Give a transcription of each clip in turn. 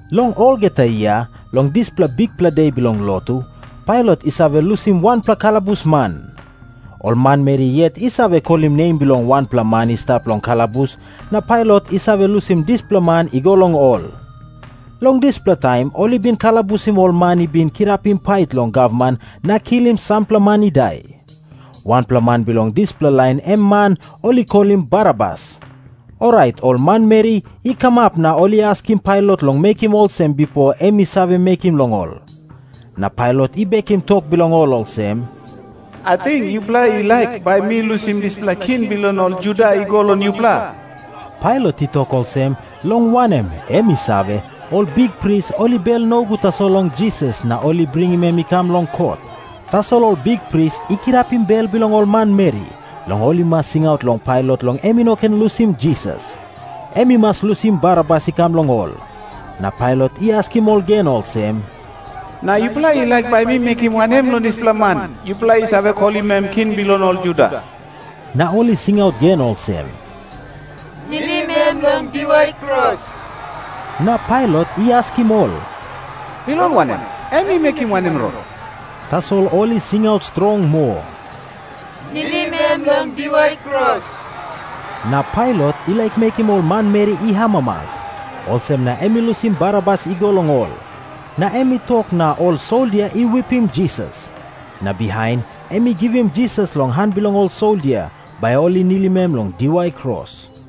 Long olgeta yia long dispela bikpela de bilong lotu, Pailat i save lusim wanpela kalabusman. Ol manmeri yet i save kolim nem bilong wanpela man i stap long kalabus, na Pailat i save lusim dispela man i go long ol. Long dispela taim ol i bin kalabusim ol man i bin kirapim pait long gavman na kilim sampela man i dai. Wanpela man bilong dispela lain em man ol i kolim Barabas. Orait ol manmeri i kamap na ol i askim Pailat long mekim olsem bipo em i save mekim long ol. Na Pailat i bekim tok bilong ol olsem, “Ating yupela i laik bai mi lusim dispela king bilong ol Juda i go long yupela?” Pailat i tok olsem, long wanem, em i save, ol bikpris ol i bel nogut tasol long Jisas na ol i bringim em i kam long kot. Tasol ol bikpris i kirapim bel bilong ol manmeri, long ol i mas singaut long Pailat long em i no ken lusim Jisas. Em i mas lusim Barabas i kam long ol. Na Pailat i askim ol gen olsem, “Na yupela i laik bai mi mekim wanem long dispela man, yupela i save kolim em king bilong ol Juda?” Na ol i singaut gen olsem, “Nilim em long diwai kros.” Na Pailat i askim ol, “Bilong wanem? Em i mekim wanem rong?” Tasol ol i singaut strong moa, “Nilim em long diwai kros.” Na Pailat i laik mekim ol manmeri i amamas. Olsem na em i lusim Barabas i go long ol. Na em i tok na ol soldia i wipim Jisas. Na bihain em i givim Jisas long han bilong ol soldia, bai ol i nilim em long diwai kros.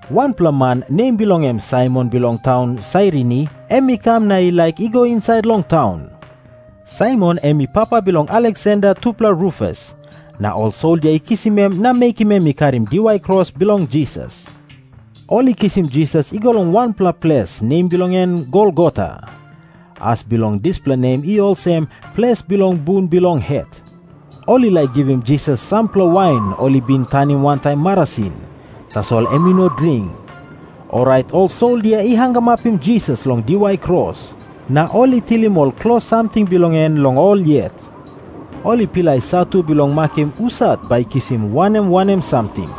Wanpela man, nem bilong en Saimon bilong taun Sairini, em i kam na i laik i go insait long taun. Saimon em i papa bilong Aleksander tupela Rufus. Na ol soldia i kisim em na mekim em i karim diwai kros bilong Jisas. Ol i kisim Jisas i go long wanpela ples, nem bilong en Golgota. As bilong dispela nem i olsem, Ples bilong bun bilong het. Ol i laik givim Jisas sampela wain ol i bin tanim wantaim marasin. Tasol em i no dring. Orait ol soldia i hangamapim Jisas long diwai kros. Na ol i tilim ol klos samting bilong en long ol yet. Ol i pilai satu bilong makim husat bai i kisim wanem wanem samting.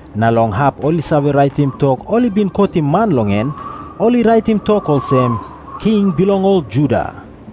Na long hap ol i save raitim tok ol i bin kotim man long en, ol i raitim tok olsem, “King bilong ol Juda.”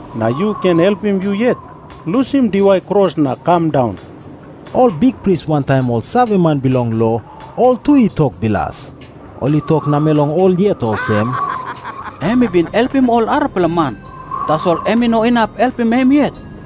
Nau yu ken helpim yu yet. Lusim diwai kros na kam daun.” Ol bikpris wantaim ol saveman bilong lo, ol tu i tok bilas. Ol i tok namel long ol yet olsem, “Em i bin helpim ol arapela man, tasol em i no inap helpim em yet.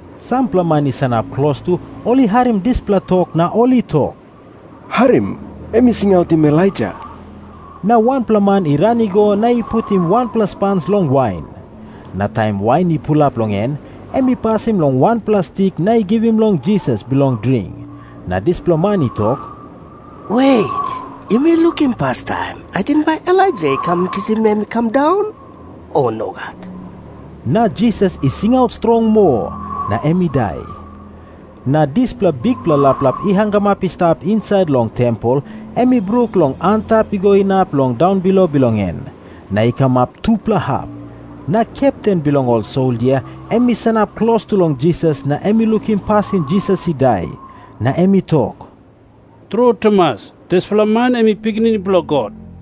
Sampela man i sanap klostu, ol i harim dispela tok na ol i tok, “Harim. Em i singautim Elaija.” Na wanpela man i ran i go na i putim wanpela spans long wain. Na taim wain i pulap long en, em i pasim long wanpela stik na i givim long Jisas bilong dring. Na dispela man i tok, “Wet, yumi lukim pastaim. Ating bai Elaija i kam kisim em i kam daun, o nogat?” Na Jisas i singaut strong moa, na em i dai. Na dispela bikpela laplap i hangamap i stap insait long tempel em i bruk long antap i go inap long daunbilo bilong en, na i kamap tupela hap. Na kepten bilong ol soldia em i sanap klostu long Jisas na em i lukim pasin Jisas i dai. Na em i tok, “Tru tumas, dispela man em i Pikinini Bilong God.”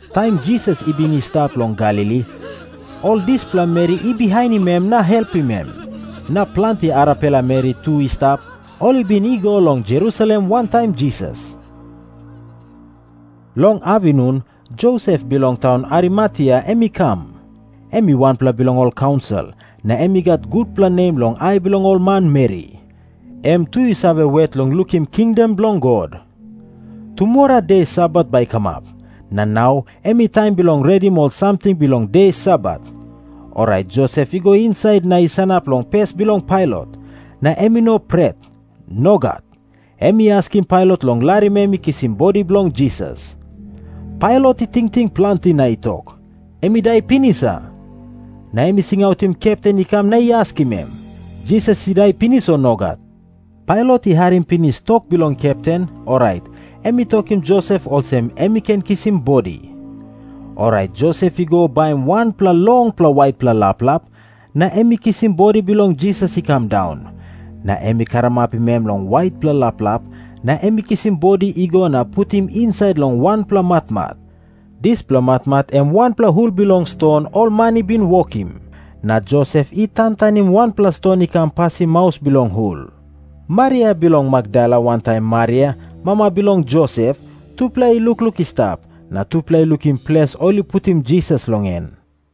Taim Jisas i bin i stap long Galili, ol dispela meri i bihainim em na helpim em. Na planti arapela meri tu i stap, ol i bin i go long Jerusalem wantaim Jisas. Long apinun Josep bilong taun Arimatea em i kam. Em i wanpela bilong ol kaunsil, na em i gat gutpela nem long ai bilong ol manmeri. Em tu i save wet long lukim kingdom bilong God. Tumora de Sabat bai i kamap, na nau em i taim bilong redim ol samting bilong de Sabat. Orait Josep i go insait na i sanap long pes bilong Pailat, na em i no pret. Nogat. Em i askim Pailat long larim em i kisim bodi bilong Jisas. Pailat i tingting planti, na i tok, “Em i dai pinis, a?” Na em i singautim kepten i kam, na i askim em, “Jisas i dai pinis, o nogat?” Pailat i harim pinis tok bilong kepten, orait em i tokim Josep olsem em i ken kisim bodi. Orait Josep i go baim wanpela longpela waitpela laplap, na em i kisim bodi bilong Jisas i kam daun. Na em i karamapim em long waitpela laplap, na em i kisim bodi i go na i putim insait long wanpela matmat. Dispela matmat em wanpela hul bilong ston ol man i bin wokim. Na Josep i tantanim wanpela ston i kam pasim maus bilong hul. Maria bilong Makdala wantaim Maria, mama bilong Josep, tupela i lukluk i stap, na tupela i lukim ples ol i putim Jisas long en.